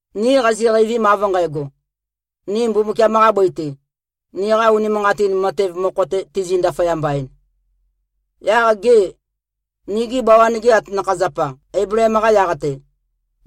Ni qaziqeivim av nqægo, ni Mbumbukiam-qa bøi-te, niqa unimanqatin matev mokho-te tizi꞉-ndaføyamba-en, yaq gê, nigi bawan-ge atanakha-zapa Eibleem-qa yaq-te,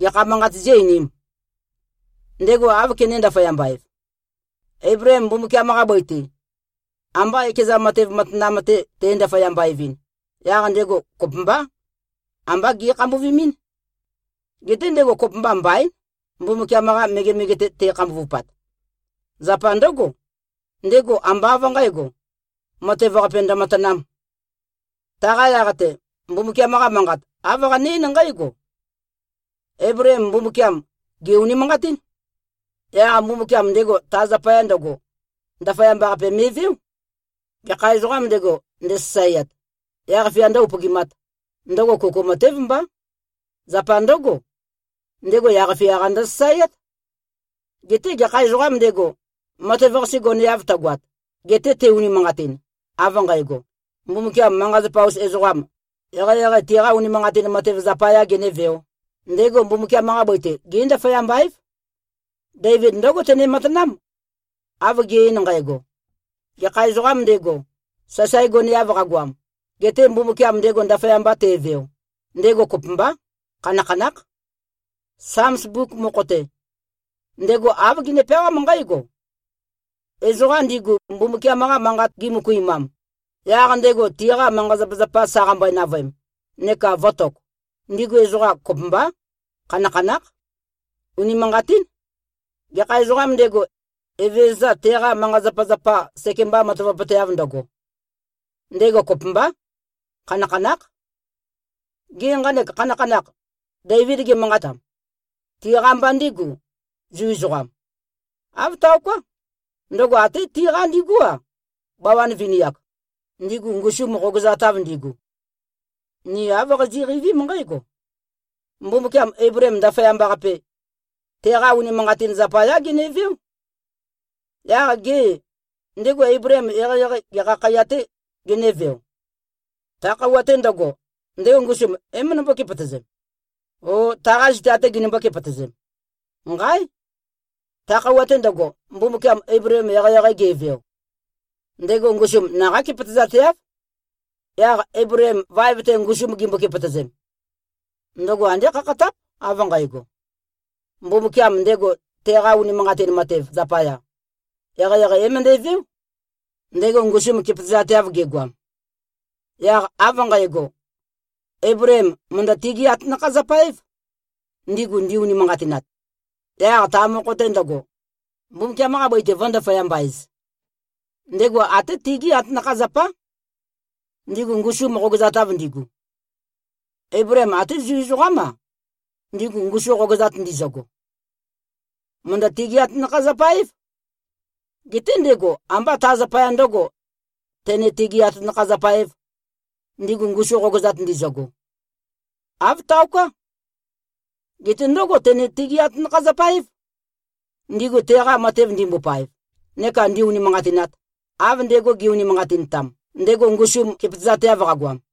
gekha manqat zí-einīm? Ndego áv kené-ndaføyamba-ev? Eibleem Mbumbukiam-qa bøi-te, amba ekeza matev matanam-te te꞉-ndaføyamba-evɨn, yaq ndego kopømbá, ambá ge꞉khambuvimín. Geté ndego kopømba mbaín, Mbumbukiam-qa megemege-te te꞉khambuvupat. Zapa ndǿgo, ndego ambá av nqǣgo, matev-qape ndømatanām. Taqa yaq-te, Mbumbukiam-qa Manqat, āv qane-eín nqǽgo, “Eibleem Mbumbukiam, gè-unimanqatín. Yaq Mbumbukiam ndego ta zapaya ndøgo, ndaføyamba-qape me꞉veó.” Gekha ezoqām ndego, ndesasaeat, yaq-fia ndǿ-upøgimāt, ndøgo kuku matév mbá. Zapa ndǿgo, ndego fia-qa ndøsasaeát. Geté gekha ezoqām ndego, matev-qase goneav tøgoat, gete te-unimanqatin, av nqægo, Mbumbukiam manqa-zapa-us ezoqam, eqeieqei tiqa unimanqatin matev zapayā genēveō, ndego Mbumbukiam-qa bøi-te gé꞉-ndaføyamba-év. Deivid ndǿgo tene-manqatám, av ge꞉-ein nqægo: Gekha ezoqām ndego, sasae goneav qagoam, gete Mbumbukiam ndego ndaføyamba teveo, ndego kopømbá, khanakhanákh. Sams mbuk mokho-te, ndego āv gene-peawám nqǽgo: “Ezoqa ndigu Mbumbukiam-qa Manqat gimøkuimam, yaq ndego tiqa manqa-zapazapa sa qambøe-navøem neka vø̄tok, ndigu ezoqa kopømbá, khanakhanákh. Unimanqatín. Gekha ezoqām ndego, Evezøza teqa manqa-zapazapa sekemba matavapøteav ndøgo, ndego kopømbá, khanakhanákh.” Gê, nqanek khanakhanakh, Deivid ge꞉manqatam, tiqa mba ndígù, Zu ezoqam? Āv taoká. Ndøgo até tiqa ndigú-a, bawan vini-ak, ndigu ngusum qogøzatav ndigu. Ni āv qazi꞉qeivím nqǽgo: Mbumbukiam Eibleem ndaføyamba-qape, teqa unimanqatin zapayá geneveó. Yaq gê, ndego Eibleem eqeieqei gekha khaiya-tē genéveo? Ta khøuwa-te ndøgo, ndego ngusum é-møndømbó-kepøtøzem, ó, taqā zita-tē ginømbō-kepøtøzem? Nqáe! Ta khøuwa-te ndøgo, Mbumbukiam Eibleem eqeieqei geveo, ndego ngusum naqá kepøtøzateáv. Yaq Eibleem vaev-te ngusum gimbo-kepøtøzem, ndøgo andé khakhatáp av nqægo, Mbumbukiam ndego teqa unimanqatin matev zapaya, eqeieqei é-møndæveó, ndego ngusum kepøtøzateav gegoam. Yaq av nqægo, Eibleem mø̀ndø-tigí-atanakha-zapa-év, ndigu ndi-unimanqatinat, yaq ta mokho-te ndøgo, Mbumbukiam-qa bøi-te vø̄-ndaføyamba-ez. Ndego até tigí atanakha-zapá, ndigu ngusum qogøzatav ndigu. Eibleem até Zu ezoqám-a, ndigu ngusu qogøzat ndizøgo, mø̀ndø-tigí-atanakha-zapa-év. Geté ndego ambá ta zapaya ndǿgo, tene-tigī-atanakha-zapa-ēv, ndigu ngusu qogøzat ndizøgo. Āv taoká. Geté ndǿgo tene-tigi-atanakha-zapa-év, ndigu teqa matev ndimbopaev neka ndi-unimanqatinat, av ndego ge꞉-unimanqatintam, ndego ngusum kepøtøzateav qagoam.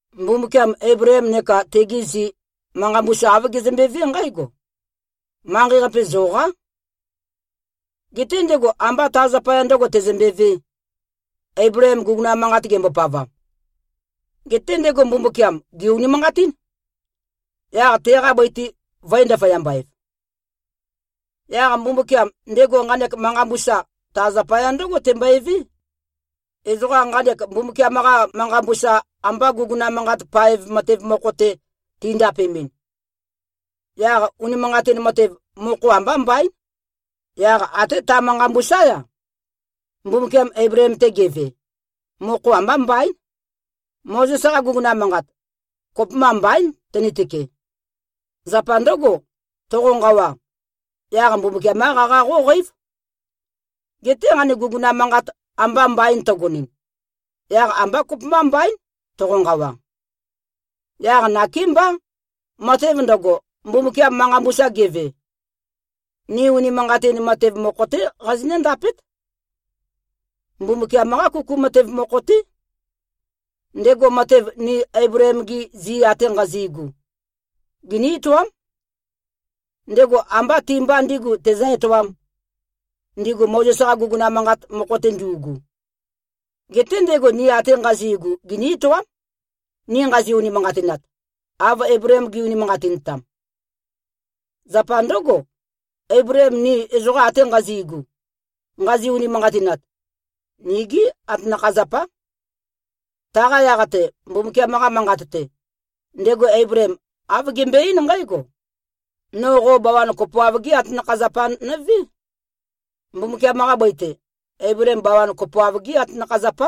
Mbumbukiam Eibleem neka tegi zi, manqa mbusa āv gezømbevé nqǽgo, “Manqei-qape zoqá.” Geté ndego ambá ta zapaya ndø̄go tezømbevē, Eibleem guguna manqat gembopavam. Geté ndego Mbumbukiam, gè-unimanqatín, yaq teqa bøi-te vø̄e-ndaføyamba-ev. Yaq Mbumbukiam, ndego nqanek manqa mbusa, ta zapaya ndǿgo tembøevé. Ezoqa nqanek Mbumbukiam-qa manqa mbusa amba guguna manqat paev matev mokho-te tindapemɨn, yaq unimanqatin matev, mokho ambá mbaín. Yaq até ta manqa mbusá-ya, Mbumbukiam Eibleem-te geve, mokho ambá mbaín. Mozes-qa guguna manqat, kopømba mbaín tønitøke. Zapa ndǿgo, toqonqawa, yaq Mbumbukiam-qá qaqa qóqeív. Geté nqanek guguna manqat amba mbain tøgonɨn, yaq ambá kopømba mbaín, toqonqawa. Yaq nakémbá, matev ndøgo, Mbumbukiam manqa mbusa geve, ni unimanqatin matev mokho-té qazinǿ-ndapét. Mbumbukiam-qá kuku matev mokho-té. Ndego matev ni Eibleem-gi zi ate nqazi꞉gu, giní-etoám. Ndego ambá ti-mba ndīgu tezǿ-etoām, ndigu Mozes-qa guguna manqat mokho-te ndu꞉gu. Geté ndego ni ate nqazi꞉gu giní-etoám, ni nqazi-unimanqatinat, av Eibleem ge꞉-unimanqatintam. Zapa ndǿgo, Eibleem ni ezoqa ate nqazi꞉gu, nqazi-unimanqatinat, nigí atanakha-zapá. Taqa yaq-te, Mbumbukiam-qa manqat-te, ndego Eibleem āv gembøe-eín nqǽgo, “No qo bawan kopoav-gé atanakha-zapa nøvé.” Mbumbukiam-qa bøi-te, Eibleem bawan kopoav-gé atanakha-zapá.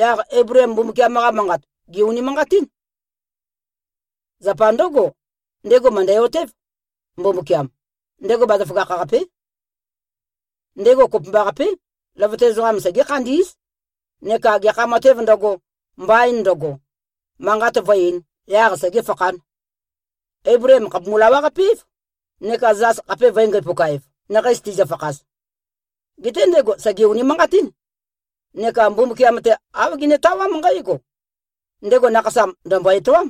Yaq Eibleem Mbumbukiam-qa manqat, gè-unimanqatín. Zapa ndǿgo, ndego mø̀ndæ-otév, Mbumbukiam, ndego bazaføgakh-qapé. Ndego kopømbaqapé, løvøte ezoqam segé-khandí꞉z neka gekha matēv ndøgo, mbain ndøgo, manqat vǿ-eīn, yaq segēfakhān. Eibleem khàpumu-lawaqape-év, neka zas khape vø̄e-ngæpuka-ev, nakhei tizøfakhaz. Geté ndego sège-unimanqatín, neka Mbumbukiam-te, āv genetawám nqǽgo: Ndego nakhasam ndø̀mbo-etoám,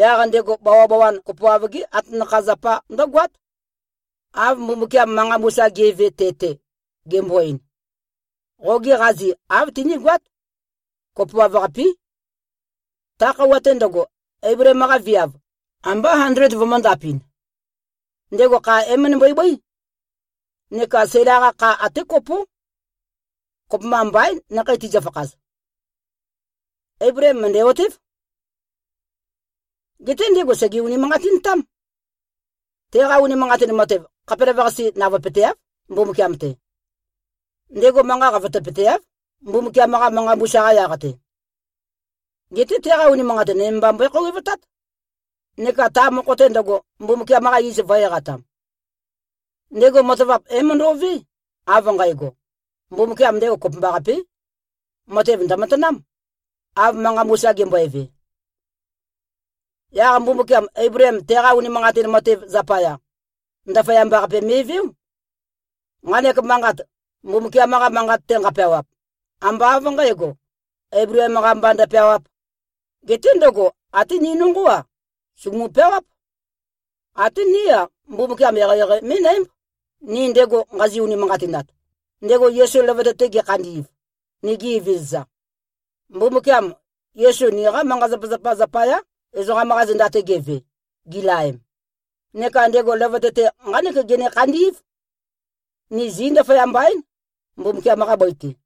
yaq ndego bawabawan kopoav-gé atanakha-zapa ndǿgoát, av Mbumbukiam manqa mbusa ge꞉ve te-te, gembo-ein, “Qogi qazi av tinīgoāt. Kopoav-qapī.” Ta khøuwa-te ndøgo, Eibleem-qa viav, ambá andled vømø̄ndapɨn. Ndego kha é-møndømbøe-bøí. Neka Sæla-qa kha até kopó. Kopømba mbaín nakhei tizøfakhaz. Eibleem mø̀ndæ-otév. Geté ndego sège-unimanqatintám. Teqa unimanqatin matev, khapelavøqase navøepøteáv, Mbumbukiam-te. Ndego manqa qavotøpøteáv, Mbumbukiam-qa manqa mbusa-qa yaq-te. Geté teqa unimanqatin nøme mba mbøe-khouwevtát, neka ta mokho-te ndøgo, Mbumbukiam-qa iz vø̄-eqatam. Ndego matavap é-møndo꞉vé av nqægo: Mbumbukiam ndego kopømbaqapé, matev ndø̀matanám, av manqa mbusa gembøeve. Yaq Mbumbukiam, Eibleem teqa unimanqatin matev zapaya, ndaføyamba-qape me꞉veó. Nqanek manqat, Mbumbukiam-qa Manqat-te nqapeawap, ambá av nqǣgo, Eibleem-qa mba ndøpeawāp. Geté ndøgo, até ni nonqó-a, sùgumu-peawáp. Até ní-a, Mbumbukiam eqeieqei mí꞉nǽmb, ni ndego nqazi-unimanqatinat, ndego Yesu løvøte-te gekhandi꞉v, nigi Evezøza. Mbumbukiam Yesu niqa manqa-zapazapa zapayá, ezoqam-qa zenda-te geve, gilaem. Neka ndego løvøte-te nqánek gene-khandí꞉v: Ni zí꞉-ndaføyamba-én, Mbumbukiam-qa bøi-te.